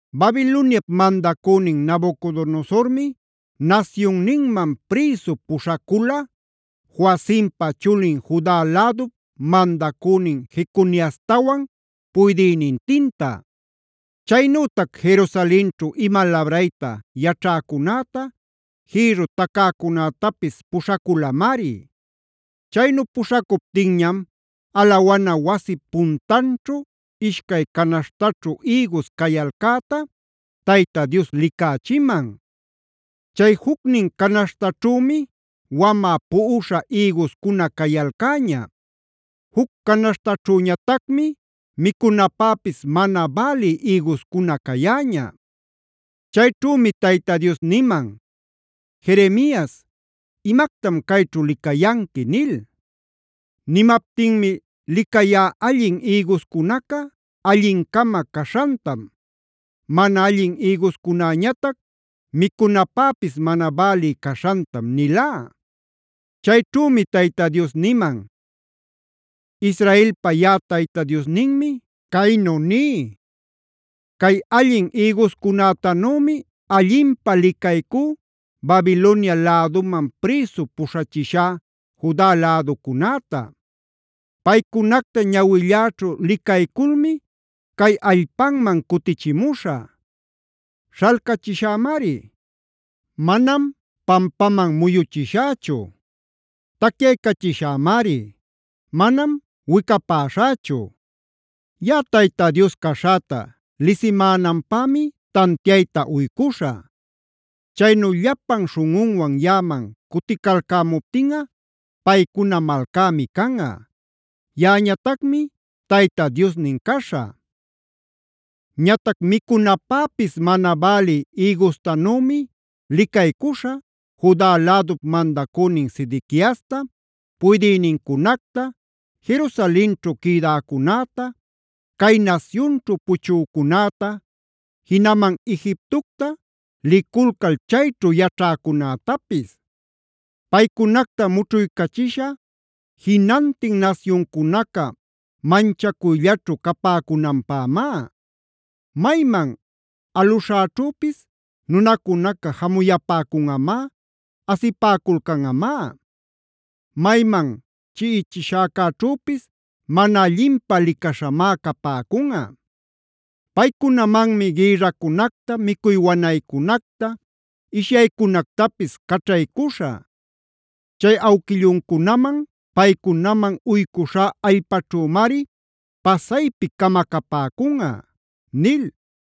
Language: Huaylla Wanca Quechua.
Babiloniap mandacünin Nabucodonosormi nasyunninman prïsu puśhacula Joacimpa chulin Juda lädup mandacünin Jeconiastawan puydïnintinta. Chaynütac Jerusalenćhu ima labrayta yaćhäcunäta, jïrru tacäcunätapisa puśhaculamari. Chaynu puśhacuptinñam alawana wasip puntanćhu ishcay canaśhtaćhu ïgus cayalcäta Tayta Dios licächiman. Chay jucnin canaśhtaćhümi wamä puꞌuśha ïguscuna cayalcäña; juc canaśhtaćhüñatacmi micunapäpis mana bälï ïguscuna cayäña. Chayćhümi Tayta Dios niman: “Jeremias, ¿imactam cayćhu licayanqui?” nil. Nimaptinmi: “Licayá, allin ïguscunaca allin-cama caśhantam; mana allin ïguscunäñatac micunapäpis mana bälï caśhantam” nilá. Chayćhümi Tayta Dios niman: “Israelpa yaꞌa Tayta Diosninmi caynu ní: Cay allin ïguscunätanümi allinpä licaycú Babilonia läduman prïsu puśhachishá Juda läducunäta. Paycunacta ñawilläćhu licayculmi cay allpanman cutichimuśhä. Śhalcachishämari; manam pampaman muyuchishächu. Tacyaycachishämari; manam wicapäśhächu. Yaꞌa Tayta Dios caśhäta lisimänanpämi tantiayta uycuśhä. Chaynu llapan śhunꞌunwan yaꞌaman cuticalcämuptinꞌa paycuna malcämi canꞌa; yaꞌañatacmi Tayta Diosnin caśhä. “Ñatac micunapäpis mana bälï ïgustanümi licaycuśhä, Juda lädup mandacünin Sedequiasta, puydïnincunacta, Jerusalenćhu quïdäcunäta, cay nasyunćhu puchücunäta, jinaman Egiptocta liculcal chayćhu yaćhäcunätapis. Paycunacta mućhuycachishä jinantin nasyuncunaca manchacuyllaćhu capäcunanpämá. Mayman aluśhäćhüpis nunacunaca jamuyapäcunꞌamá, asipäculcanꞌamá; mayman chiꞌichishäcäćhüpis mana allinpä licaśhamá capäcunꞌa. Paycunamanmi gïrracunacta, micuy wanaycunacta, ishyaycunactapis caćhaycuśhä. Chay awquilluncunaman, paycunaman uycuśhá allpaćhümari pasaypi camacapäcunꞌa” nil.